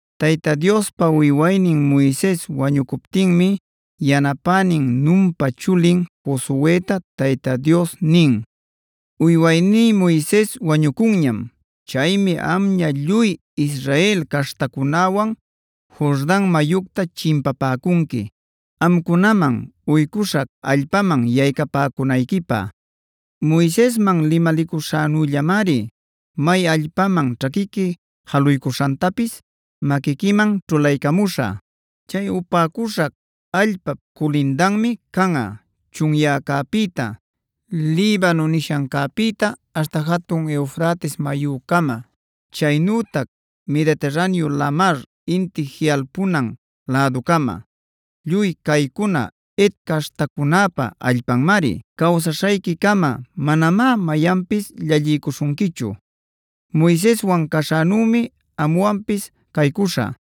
Tayta Diospa uywaynin Moises wañucuptinmi yanapänin Nunpa chulin Josueta Tayta Dios nin: “Uywayní Moises wañucunñam. Chaymi amña lluy Israel caśhtacunäwan Jordan mayucta chimpapäcunqui, amcunaman uycuśhac allpaman yaycapäcunayquipä. Moisesman limalicuśhänüllamari may allpaman ćhaquiqui jaluycuśhantapis maquiquiman ćhulaycamuśhä. Chay upäcuśhac allpap culindanmi canꞌa: chunyäcäpïta, Libano nishancäpïta aśhta jatun Eufrates mayücama, chaynütac Mediterraneo lamar inti jiꞌalpunan läducama; lluy caycuna Het caśhtacunäpa allpanmari. Cawsaśhayquicama manamá mayanpis llalliycuśhunquichu.a Moiseswan caśhänümi amwanpis caycuśhä;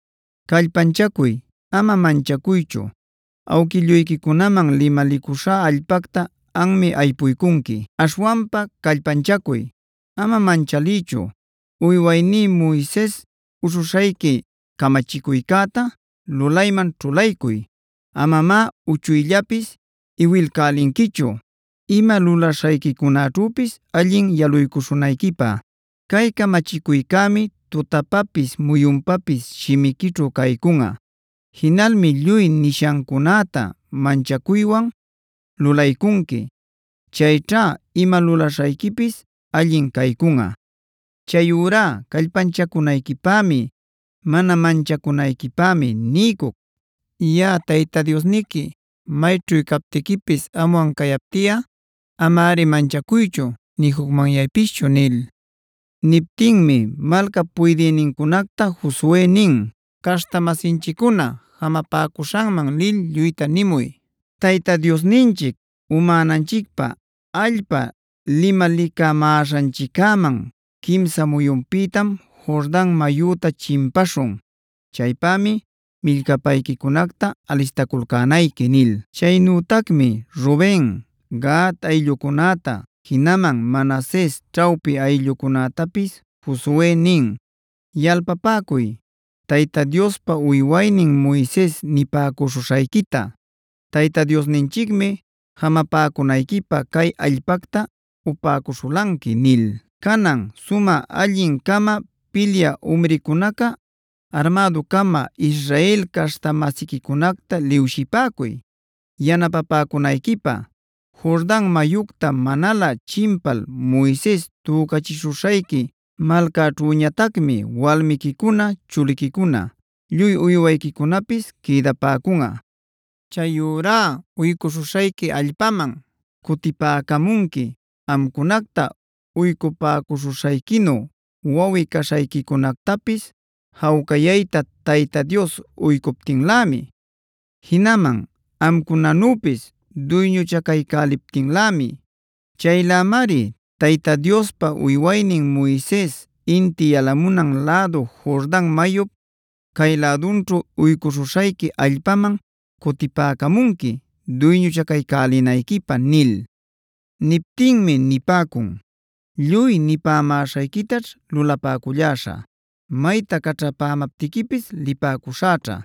Callpanchacuy,c ama manchacuychu. Awquilluyquicunaman limalicuśhá allpacta anmi aypuycunqui. Aśhwanpa callpanchacuy, ama manchaliychu. Uywayní Moises uśhuśhayqui camachicuycäta lulayman ćhulaycuy. Amamá uchuyllapis iwilcälinquichu, ima lulaśhayquicunaćhüpis allin yaluycuśhunayquipä. Cay camachicuycämi tutapapis muyunpapis shimiquićhu caycunꞌa. Jinalmi lluy nishancunäta manchacuywan lulaycunqui. Chayćha ima lulaśhayquipis allin caycunꞌa. Chayurá callpanchacunayquipämi, mana manchacunayquipämi niycuc. Yaꞌa Tayta Diosniqui mayćhu captiquipis amwan cayaptiꞌa amari manchacuychu nï jucmanyaypischu” nil. Niptinmi malcap puydïnincunacta Josue nin: “Caśhta-masinchiccuna jamapäcuśhanman lil lluyta nimuy: ‘Tayta Diosninchic umänanchicpä allpa limalicamäśhanchiccäman quimsa muyunpïtam Jordan mayüta chimpaśhun. Chaypämi millcapayquicunacta alistaculcänayqui’” nil. Chaynütacmi Ruben, Gad ayllucunäta, jinaman Manases ćhawpi ayllucunätapis Josue nin: “Yalpapäcuy, Tayta Diospa uywaynin Moises nipäcuśhuśhayquita: ‘Tayta Diosninchicmi jamapäcunayquipä cay allpacta upäcuśhulanqui’ nil. Canan sumä allin-cama pilyä umricunaca armädu-cama Israel caśhta-masiquicunacta liwshipäcuy yanapapäcunayquipä. Jordan mayucta manalä chimpal Moises tücachishuśhayqui malcaćhüñatacmi walmiquicuna, chuliquicuna, lluy uywayquicunapis quïdapäcunꞌa. Chayurá uycuśhuśhayqui allpaman cutipäcamunqui amcunacta uycupäcuśhuśhayquinu wawꞌi-caśhayquicunactapis jawcayayta Tayta Dios uycuptinlämi, jinaman amcunanüpis duyñuchacaycäliptinlämi. Chaylämari Tayta Diospa uywaynin Moises inti yalamunan lädu Jordan mayup cay lädunćhu uycuśhuśhayqui allpaman cutipäcamunqui duyñuchaculcänayquipä” nil.d Niptinmi nipäcun: “Lluy nipämäśhayquitaćh lulapäculläśhä; mayta caćhapämaptiquipis lipäcuśhäćha.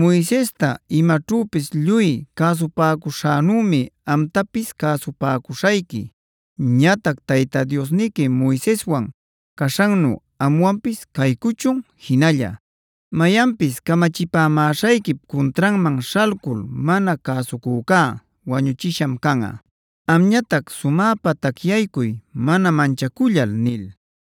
Moisesta imaćhüpis lluy cäsupäcuśhänümi amtapis cäsupäcuśhayqui. Ñatac Tayta Diosniqui Moiseswan caśhannu amwanpis caycuchun jinalla. Mayanpis camachipamäśhayquip cuntranman śhalcul mana cäsucücá wañuchisham canꞌa. Amñatac sumäpa tacyaycuy mana manchacullal”e nil.